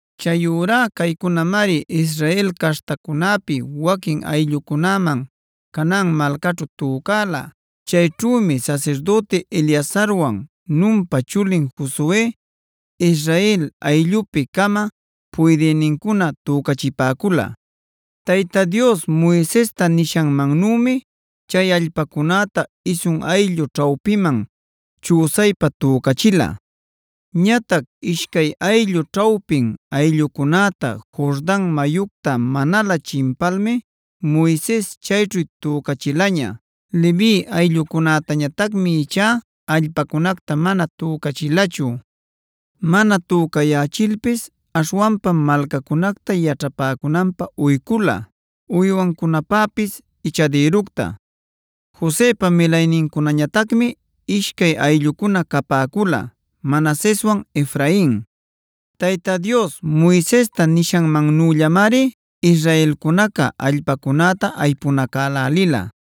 Chayurá caycunamari Israel caśhtacunäpi waquin ayllucunäman Canaan malcaćhu tücala. Chayćhümi sasirdüti Eleazarwan, Nunpa chulin Josue, Israel ayllupi-cama puydïnincuna tücachipäcula. Tayta Dios Moisesta nishanmannümi chay allpacunäta isun ayllu ćhawpiman chüsaypa tücachila.a Ñatac ishcay ayllu ćhawpin ayllucunätá Jordan mayucta manalä chimpalmib Moises chayćhu tücachilaña. Levi ayllucunätañatacmi ichá allpacunacta mana tücachilachu. Mana tücayächilpis aśhwanpam malcacunacta yaćhapäcunanpä uycula, uywancunapäpis ichadïructa. Josepa milaynincunañatacmi ishcay ayllucuna capäcula: Manaseswan Efrain. Tayta Dios Moisesta nishanmannüllamari israelcunaca allpacunäta aypunacälälila.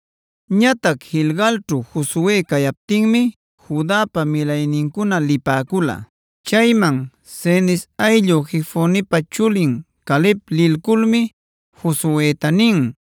Ñatac Gilgalćhu Josue cayaptinmi Judapa milaynincuna lipäcula. Chayman Cenez ayllu Jefonepa chulin Caleb lilculmi Josueta nin: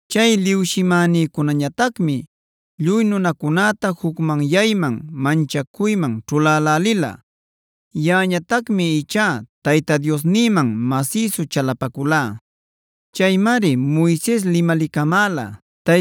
Chay liwshimänïcunañatacmi lluy nunacunäta jucmanyayman, manchacuyman ćhulälälila. Yaꞌañatacmi ichá Tayta Diosnïman masïsu chalapaculá. Chaymari Moises limalicamäla: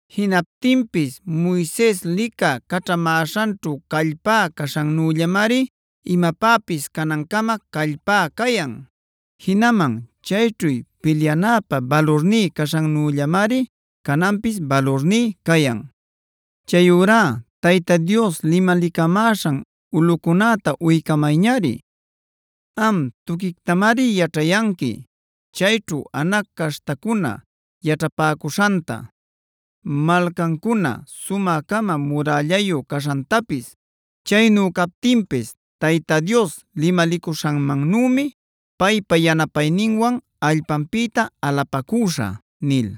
Jinaptinpis Moises licä caćhamäśhanćhu callpá caśhannüllalämari imapäpis canancama callpá cayan. Jinaman chayćhu pilyanäpä balurní caśhannüllalämari cananpis balurní cayan. Chayurá Tayta Dios limalicamäśhan ulꞌucunäta uycamayñari. Am, tuquictamari yaćhayanqui chayćhu Anac caśhtacuna yaćhapäcuśhanta, malcancuna sumä-cama murällayu caśhantapis. Chaynu captinpis Tayta Dios limalicuśhanmannümi paypa yanapayninwan allpanpïta alapacüśhä” nil.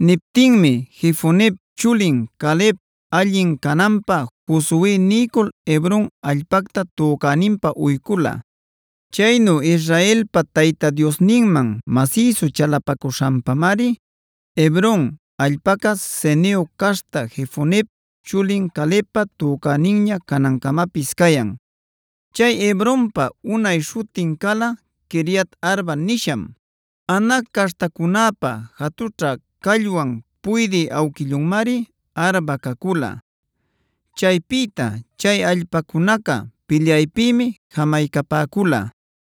Niptinmi Jefonep chulin Caleb allin cananpä Josue niycul Hebron allpacta tücäninpä uycula. Chaynu Israelpa Tayta Diosninman masïsu chalapacuśhanpamari Hebron allpaca Ceneo caśhta Jefonep chulin Calebpa tücäninña canancamapis cayan. Chay Hebronpa unay śhutin cala Quiriat-arba nisham; Anac caśhtacunäpa jatućha callwanf puydï awquillunmari Arba cacula. Chaypïta chay allpacunaca pilyaypïmi jamaycapäcula.